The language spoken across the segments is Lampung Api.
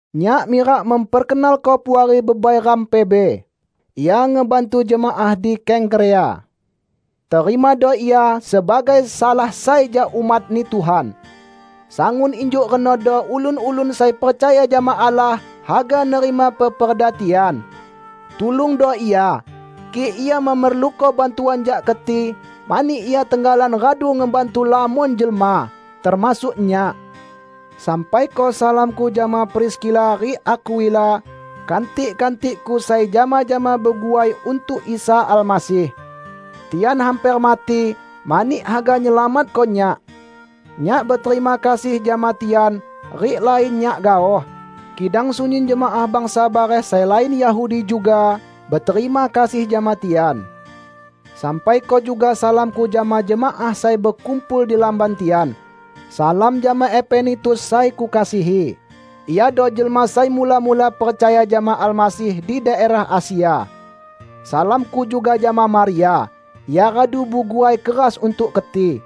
Nyak mirak memperkenalko puari bebai ram, Febe. Ia ngebantu jemaah di Kengkrea. Terimado ia sebagai salah sai jak umat-Ni Tuhan. Sangun injuk renodo ulun-ulun sai percaya jama Allah haga nerima peperda tian. Tulungdo ia, kik ia memerluko bantuan jak keti, mani ia tenggalan radu ngebantu lamon jelma -- termasuk nyak. Sampaiko salamku jama Priskila rik Akwila, kantik-kantikku sai jama-jama beguai untuk Isa Almasih. Tian hamper mati mani haga nyelamatko nyak. Nyak beterima kasih jama tian -- rik lain nyak gaoh, kidang sunyin jemaah bangsa bareh sai lain Yahudi juga beterima kasih jama tian. Sampaiko juga salamku jama jemaah sai bekumpul di lamban tian. Salam jama Epenetus sai kukasihi. Iado jelma sai mula-mula percaya jama Almasih di daerah Asia. Salamku juga jama Maria. Ia radu beguai keras untuk keti.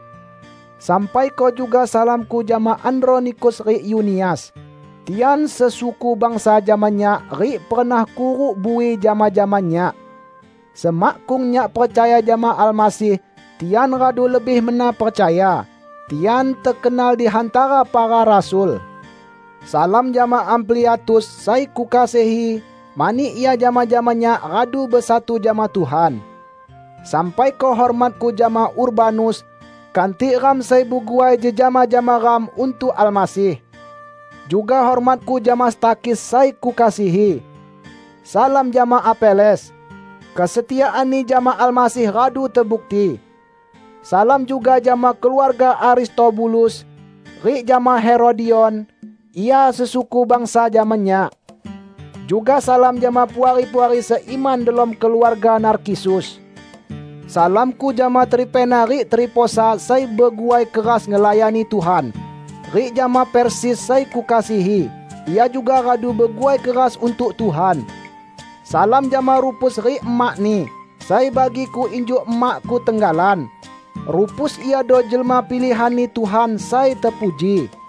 Sampaiko juga salamku jama Andronikus rik Yunias. Tian sesuku bangsa jama nyak rik pernah kuruk bui jama-jama nyak. Semakkung nyak percaya jama Almasih, tian radu lebih mena percaya. Tian tekenal di hantara para rasul. Salam jama Ampliatus, sai kukasihi mani ia jama-jama nyak radu besatu jama Tuhan. Sampaiko hormatku jama Urbanus, kantik ram sai beguai jejama jama ram untuk Almasih. Juga hormatku jama Stakhis sai kukasihi. Salam jama Apeles. Kesetiaanni jama Almasih radu tebukti. Salam juga jama keluarga Aristobulus, rik jama Herodion. Ia sesuku bangsa jama nyak. Juga salam jama puari-puari seiman delom keluarga Narkisus. Salamku jama Trifena rik Trifosa sai beguai keras ngelayani Tuhan, rik jama Persis sai kukasihi. Ia juga radu beguai keras untuk Tuhan. Salam jama Rufus rik emakni, sai bagiku injuk emakku tenggalan. Rufus iado jelma pilihan-Ni Tuhan sai tepuji.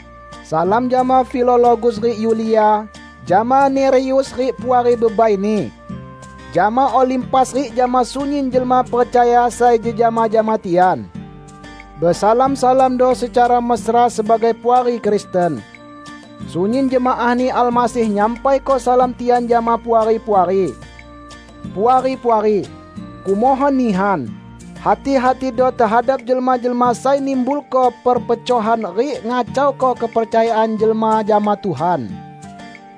Salam jama Filologus rik Yulia; jama Nereus rik puari bebaini; jama Olimpas rik jama sunyin jelma percaya sai jejama jama tian. Besalam-salamando secara mesra sebagai puari Kristen. Sunyin jemaah-Ni Almasih nyampaiko salam tian jama Puari-puari. Puari-puari! Kumohon nihan: Hati-hatido tehadap jelma-jelma sai nimbulko perpecohan rik ngacauko kepercayaan jelma jama Tuhan.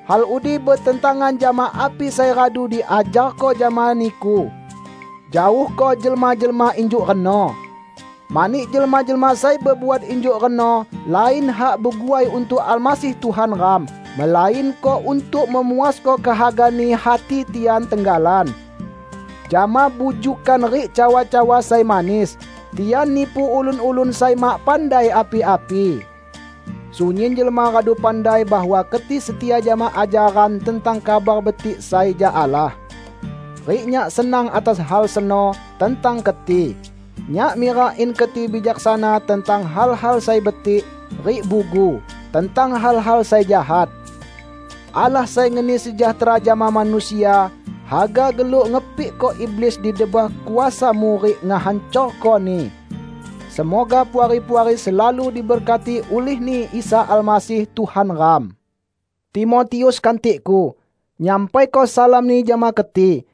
Hal udi betentangan jama api sai radu diajarko jama niku. Jaohko jelma-jelma injuk reno. Mani jelma-jelma sai bebuat injuk reno lain hak beguai untuk Almasih Tuhan ram, melainko untuk memuasko kehagani hati tian tenggalan. Jama bujukkan rik cawa-cawa sai manis, tian nipu ulun-ulun sai mak pandai api-api. Sunyin jelma radu pandai bahwa keti setia jama ajaran tentang Kabar Betik sai jak Allah. Rik nyak senang atas hal seno tentang keti. Nyak mirak in keti bijaksana tentang hal-hal sai betik, rik bugu tentang hal-hal sai jahat. Allah sai ngeni sejahtera jama manusia, haga geluk ngepikko iblis di debah kuasamu rik ngehancorkoni. Semoga Puari-puari selalu diberkati ulih-Ni Isa Almasih Tuhan ram. Timotius, kantikku, nyampaiko salamni jama keti.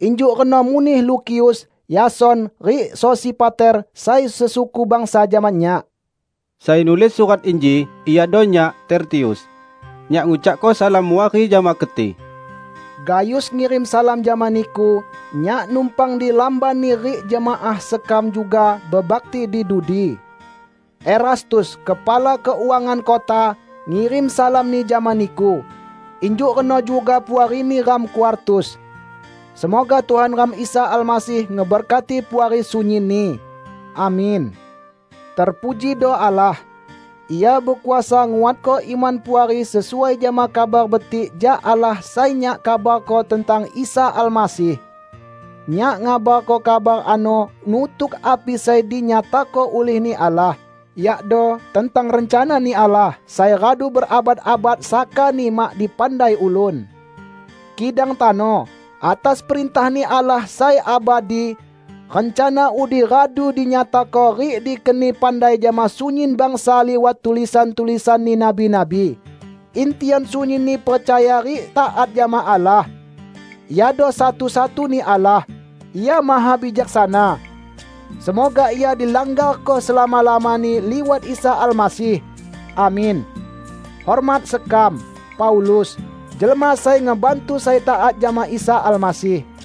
Injuk reno muneh Lukius, Yason rik Sosipater, sai sesuku bangsa jama nyak. Sai nulis surat inji iado nyak, Tertius. Nyak ngucakko salam muari jama keti. Gayus ngirim salam jama niku. Nyak numpang di lambanni rik jemaah sekam juga bebakti di dudi. Erastus, kepala keuangan kota, ngirim salamni jama niku. Injuk reno juga puarini ram Kwartus. [ Semoga Tuhan ram Isa Almasih ngeberkati Puari sunyinni. Amin.] Terpujido Allah! Ia bekuasa nguatko iman Puari sesuai jama Kabar Betik jak Allah sai nyak kabarko tentang Isa Almasih. Nyak ngabarko kabar ano nutuk api sai dinyatako ulih-Ni Allah; yakdo tentang rencana-Ni Allah sai radu berabad-abad sakani mak dipandai ulun. Kidang tano, atas perintah-Ni Allah sai abadi, rencana udi radu dinyatako rik dikeni pandai jama sunyin bangsa liwat tulisan-tulisanni nabi-nabi, in tian sunyinni percaya rik taat jama Allah. Iado satu-satuni Allah, Ia mahabijaksana. Semoga Ia dilanggarko selama-lamani liwat Isa Almasih! Amin. Hormat sekam, Paulus, jelma sai ngebantu sai taat jama Isa Almasih